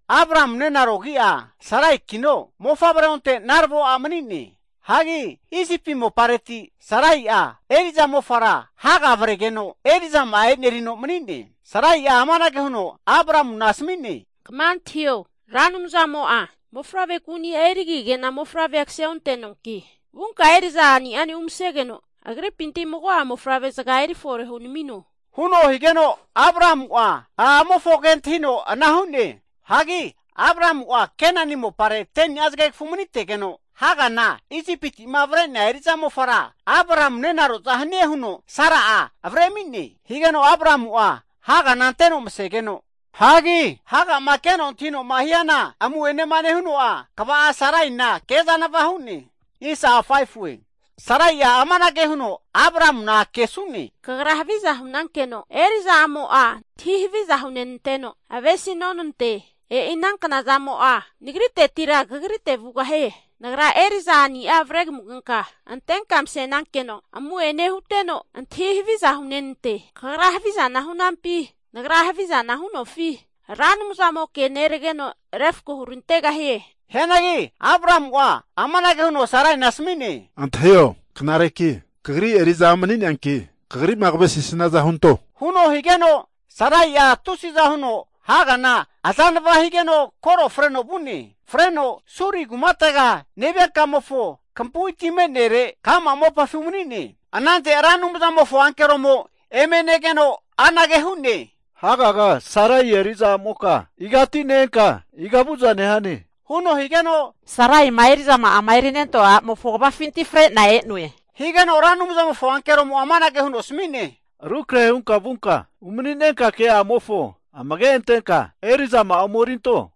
Abramu nenaro agi'a Saraikino, mofavre onte narvo a' mani'ne. Hagi Isipi mopareti Sarai'a eri'za mofa'a Haga avregeno eri'zama'a enerino mani'ne. Sarai'a amanage huno Abramuna asami'ne, Kama antahio. Ra Anumzamo'a mofavre kuni'a erigige'na mofavre kaseontoanki, vunka eri'za a'ni'ane umasegeno agripinti mago'a mofavrezaga eri fore hunamino, huno higeno Abramu'a a'amofonke antahino ana hu'ne. Hagi Abramu'ma Kenani mopare 10ni'a zagegafu manitegeno, Hagana Isipiti'ma avre'nea eri'za mofara Abramuna nenaro'za hanie huno Sarai'a avre ami'ne. Higeno Abramu'a Hagana anteno masegeno, Haga'ma keno antahino'ma hiana amu'enema nehuno'a, kva'a Saraina ke azanava hu'ne. Hagi Sarai'a amanage huno Abramuna kesu'ne, Kagra haviza hu'nankeno eri'za a'mo'a antahi haviza hunenanteno avesinonante. E'i ana knazamo'a nagritetira kagrite vugahie. Nagra eri'za a'nia avre kamugenka antenka mase'nankeno amu'ene huteno antahi haviza hunenante. Kagra havizana hu'nampi, Nagra havizana hu'nofi, Ra Anumzamoke nerageno refko hurantegahie. Hianagi Abramu'a amanage huno Saraina asami'ne, Antahio, knareki kagri eri'za a' mani'neanki kagri'ma kavesisaniaza hunto, huno higeno Sarai'a tusiza huno Hagana azanava higeno koro freno vu'ne. Freno Suri kumatega nevia kamofo kampui ti me'nere ka'ma mopafi umani'ne. Anante Ra Anumza'mofo ankeromo eme negeno, anage hu'ne, Hagaga, Sarai eri'za a'moka igati ne-enka, iga vu'za nehane? huno higeno, Saraima eri'zama'ama eri nentoa a'mofo kvafinti fre'na e'noe. Higeno Ra Anumzamofo ankeromo'a amanage huno asami'ne, Rukrahe hunka vunka, umani'nenka ke'amofo amage antenka eri'zama'a omerinto,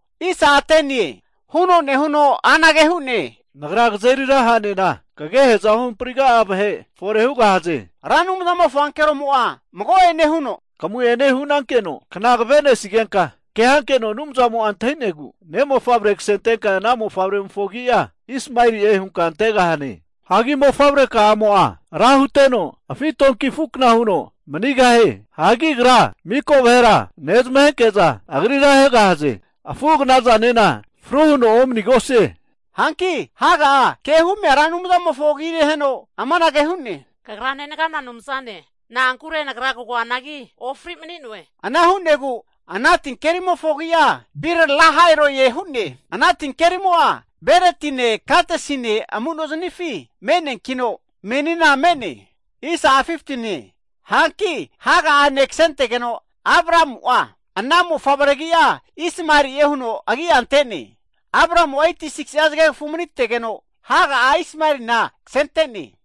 huno nehuno anage hu'ne, Nagra kazeri ra ha'nena kagehe'za ohampriga'a vahe fore hugahaze. Ra Anumzamofo ankeromo'a mago'ene huno, Kamu'ene hunankeno kna kavenesigenka ke hankeno Anumzamo'a antahi'negu ne'mofavre kasentenka ana mofavremofo agi'a Ismaeli'e hunka antegahane. Hagi mofavre ka'amo'a ra huteno, afi' donki afu kna huno manigahie. Hagi agra mika vahera nezmahenke'za agrira ahegahaze. Afu agna'zanena fru huno omanigosie. Hanki Haga'a ke humia Ra Anumzamofo agi neheno amanage hu'ne, Kagra nenagana Anumzane, na'ankure nagra kagoanagi ofri mani'noe. Ana hu'negu ana tinkerimofo agi'a Bir Lahai Roie hu'ne. Ana tinkerimo'a Beretine, Kadesine amunozanifi me'neankino, menina me'ne. Hanki Haga'a ne' kasentegeno, Abramu'a ana mofavre agi'a Ismaeli'e huno agi'a ante'ne. Abramu'a 86'a zagegafu manitegeno Haga'a Ismaelina kasente'ne.